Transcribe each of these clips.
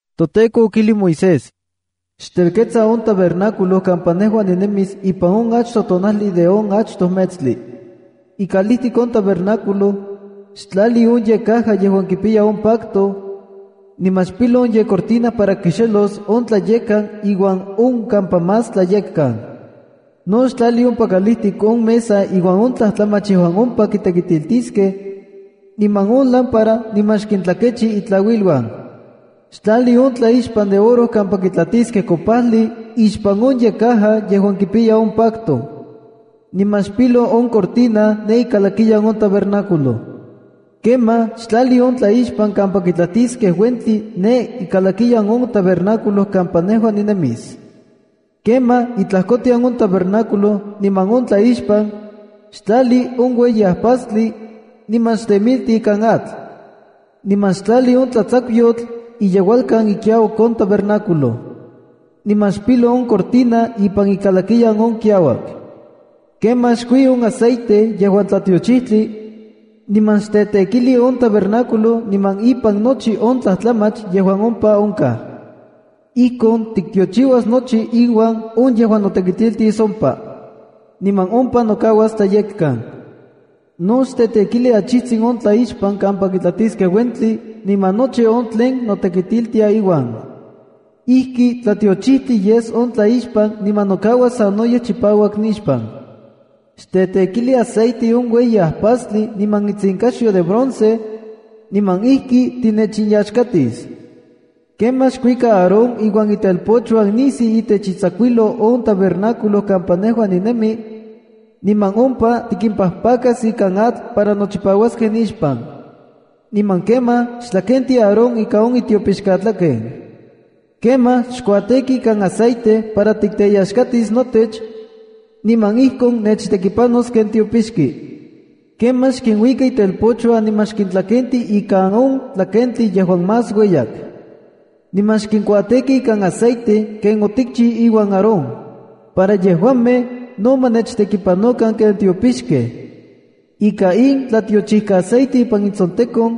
ToTEKO okijlij Moisés: “Xtelketsa on tabernáculo kampa nejua ninemis ipan on achtoj tonajli de on achtoj metstli. Ikalijtik on tabernáculo, xtlali on yekcaja yejuan kipiya on pacto, niman xpilo on yekcortina para kixelos on Tlayekkan iuan on kampa Más Tlayekkan. No xtlali ompa kalijtik on mesa iuan on tlajtlamach yejuan ompa kitekitiliskej, niman on lámpara niman xkintlakechi itlauiluan. Xtlali on tlaixpan de oro kampa kitlatiskej kopajli ixpan on yekcaja yejuan kipiya on pacto. Niman xpilo on cortina ne ikalakiyan on tabernáculo. Kemaj xtlali on tlaixpan kampa kitlatiskej uentli ne ikalakiyan on tabernáculo kampa nejua ninemis. Kemaj itlajkotian on tabernáculo niman on tlaixpan, xtlali on ueyi ajpastli, niman xtemilti ikan atl. Niman xtlali on tlatsakuyotl iyeualkan ikiauak on tabernáculo. Niman xpilo on cortina ipan ikalakiyan on kiauak. ’Kemaj xkui on aceite yejuan tlatiochijtli, niman xtetekili on tabernáculo niman ipan nochi on tlajtlamach yejuan ompa onkaj. Ijkon tiktiochiuas nochi iuan on yejuan notekitiltis ompa. Niman ompa nokauas tlayekkan. No xtetekili achijtzin on tlaixpan kampa kitlatiskej uentli, niman nochi on tlen notekitiltia iuan. Ijki tlatiochijtli yes on tlaixpan niman nokauas sanoyej chipauak nixpan. Xtetekili aceite on ueyi ajpastli niman itsinkaxyo de bronce, niman ijki tinechinyaxkatis. ’Kemaj xkuika Aarón iuan itelpochuan nisiu itech itsakuijlou on tabernáculo kampa nejua ninemi, niman ompa tikimpajpakas ikan atl para nochipauaskej nixpan. Niman kemaj xtlakenti Aarón ika on itiopixkatlaken. Kemaj xkuatêki ikan aceite para tikteyaxkatis notech, niman ijkon nechtekipanos ken tiopixki. Kemaj xkinuika itelpochuan niman xkintlakenti ika on tlakentli yejuan más ueyak. Niman xkinkuatêki ikan aceite ken otikchiu iuan Aarón, para yejuamej no ma nechtekipanokan ken tiopixkej. Ika in tlatiochikkaaceite ipan intsontekon,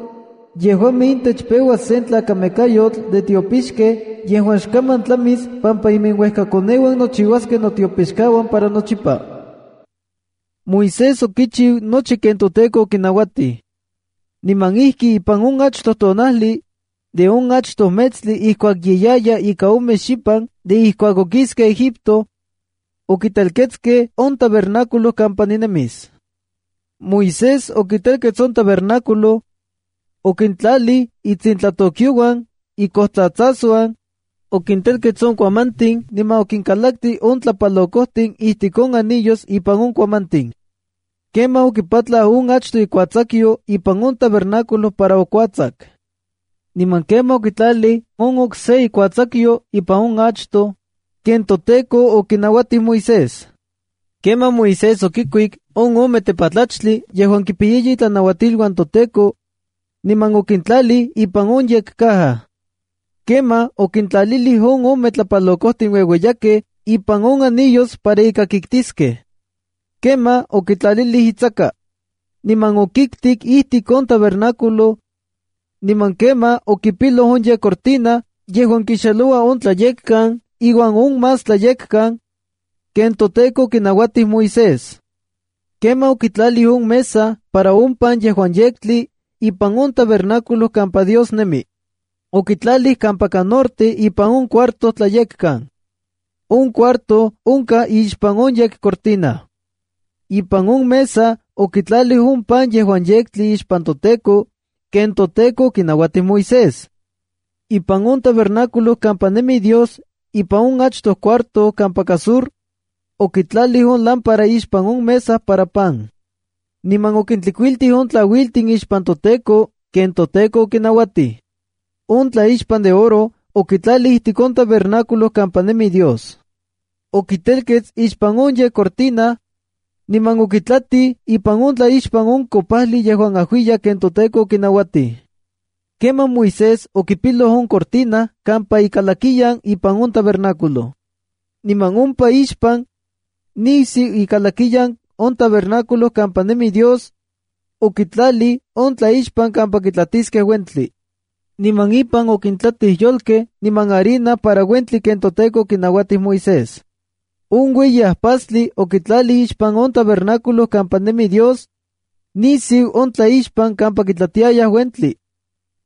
yejuamej intech peuas sen tlakamekayotl de tiopixkej yejuan xkaman tlamis pampa iminuejkakoneuan nochiuaskej notiopixkauan para nochipa.” Moisés okichiu nochi ken toTEKO okinauatij. Niman ijki ipan on achtoj tonajli, de on achtoj metstli ijkuak ye yaya ika ome xipan de ijkuak okiskej Egipto, okitelketskej on tabernáculo kampa ninemis. Moisés okitelkets on tabernáculo. Okintlalij itsintlatokyouan, ikojtsatsasuan, okintelkets on kuamantin niman okinkalaktij on tlapalokojtin ijtik on anillos ipan on kuamantin. Kemaj okipatlau on achtoj ikuatsakuyo ipan on tabernáculo para okuatsaku. Niman kemaj okitlalij on okse ikuatsakuyo ipan on achtoj, ken toTEKO okinauatij Moisés. Kemaj Moisés okikuik on ome tepatlachtli yejuan kipiyaya itlanauatiluan toTEKO, niman okintlalij ipan on yekcaja. Kemaj okintlalilij on ome tlapalokojtin ueueyakej ipan on anillos para ika kiktiskej. Kemaj okitlalilij itsaka. Niman okiktik ijtik on tabernáculo, niman kemaj okipiloj on yekcortina yejuan kixeloua on Tlayekkan iuan on Más Tlayekkan, ken toTEKO okinauatij Moisés. Kemaj okitlalij on mesa para on pan yejuan yektli, ipan on tabernáculo kampa Dios nemi. Okitlalij kampaka norte ipan on cuarto Tlayekkan. On cuarto onkaj ixpan on yekcortina. Ipan on mesa, okitlalij on pan yejuan yektli ixpan toTEKO, ken toTEKO okinauatij Moisés. Ipan on tabernáculo kampa nemi Dios ipan on achtoj cuarto kampaka sur, okitlalij on lámpara ixpan on mesa para pan. Niman okintlikuiltij on tlauiltin ixpan toTEKO, ken toTEKO okinauatij. On tlaixpan de oro okitlalij ijtik on tabernáculo kampa nemi Dios. Okitelkets ixpan on yekcortina, niman okitlatij ipan on tlaixpan on kopajli yejuan ajuiyak ken toTEKO okinauatij. Kemaj Moisés okipiloj on cortina kampa ikalakiyan ipan on tabernáculo. Niman ompa ixpan, nisiu ikalakiyan on tabernáculo kampa nemi Dios, okitlalij on tlaixpan kampa kitlatiskej uentli. Niman ipan okintlatij yolkej niman harina para uentli, ken toTEKO okinauatij Moisés. On ueyi ajpastli okitlalij ixpan on tabernáculo kampa nemi Dios, nisiu on tlaixpan kampa kitlatiayaj uentli.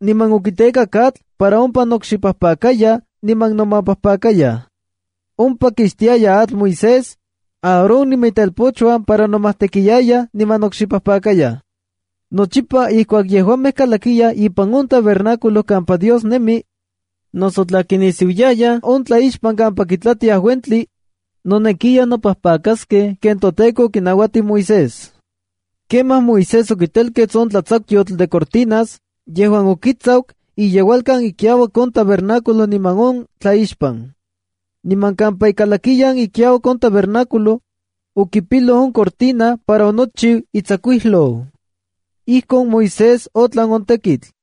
Niman okitekak atl para ompa nokxipajpakayaj niman nomapajpakayaj. Ompa kixtiaya atl Moisés, Aarón niman itelpochuan para nomajtekiayaj niman nokxipajpakayaj. Nochipa ijkuak yejuamej kalakiyaj ipan on tabernáculo kampa Dios nemi, noso tla kinisiuiyayaj on tlaixpan kampa kitlatiayaj uentli, nonekiya nopajpakaskej ken toTEKO okinauatij Moisés. Kemaj Moisés okitelkets on tlatsakuyotl de cortinas yejuan okitsaku iyeualkan ikiauak on tabernáculo niman on tlaixpan. Niman kampa ikalakiyan ikiauak on tabernáculo, okipiloj on cortina para onochiu itsakuijlou. Ijkon Moisés otlan on tekitl.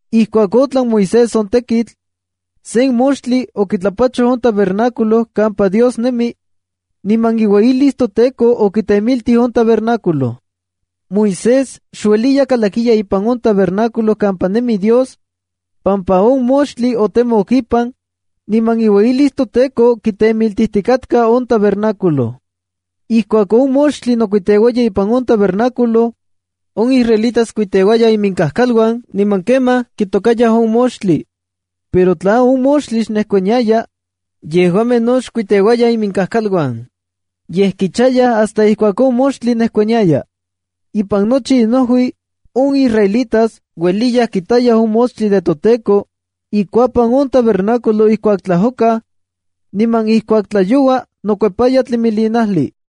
Ijkuak otlan Moisés on tekitl, sen moxtli okitlapachoj on tabernáculo kampa Dios nemi, niman iueyilis toTEKO okitemiltij on tabernáculo. Moisés xueliya kalakiya ipan on tabernáculo kampa nemi Dios, pampa on moxtli otemok ipan, niman iueyilis toTEKO kitemiltijtikatka on tabernáculo. Ijkuak on moxtli nokuiteuaya ipan on tabernáculo, on israelitas kuiteuayaj iminkajkaluan niman kemaj kitokayaj on moxtli. Pero tla on moxtli xnejkuaniaya, yejuamej no xkuiteuayaj iminkajkaluan, yej kichayaj hasta ijkuak on moxtli nejkuaniaya. Ipan nochi inojui, on israelitas ueliyaj kitayaj on moxtli de toTEKO ikuapan on tabernáculo ijkuak tlajokaj, niman ijkuak tlayoua nokuepaya tlimilinajli.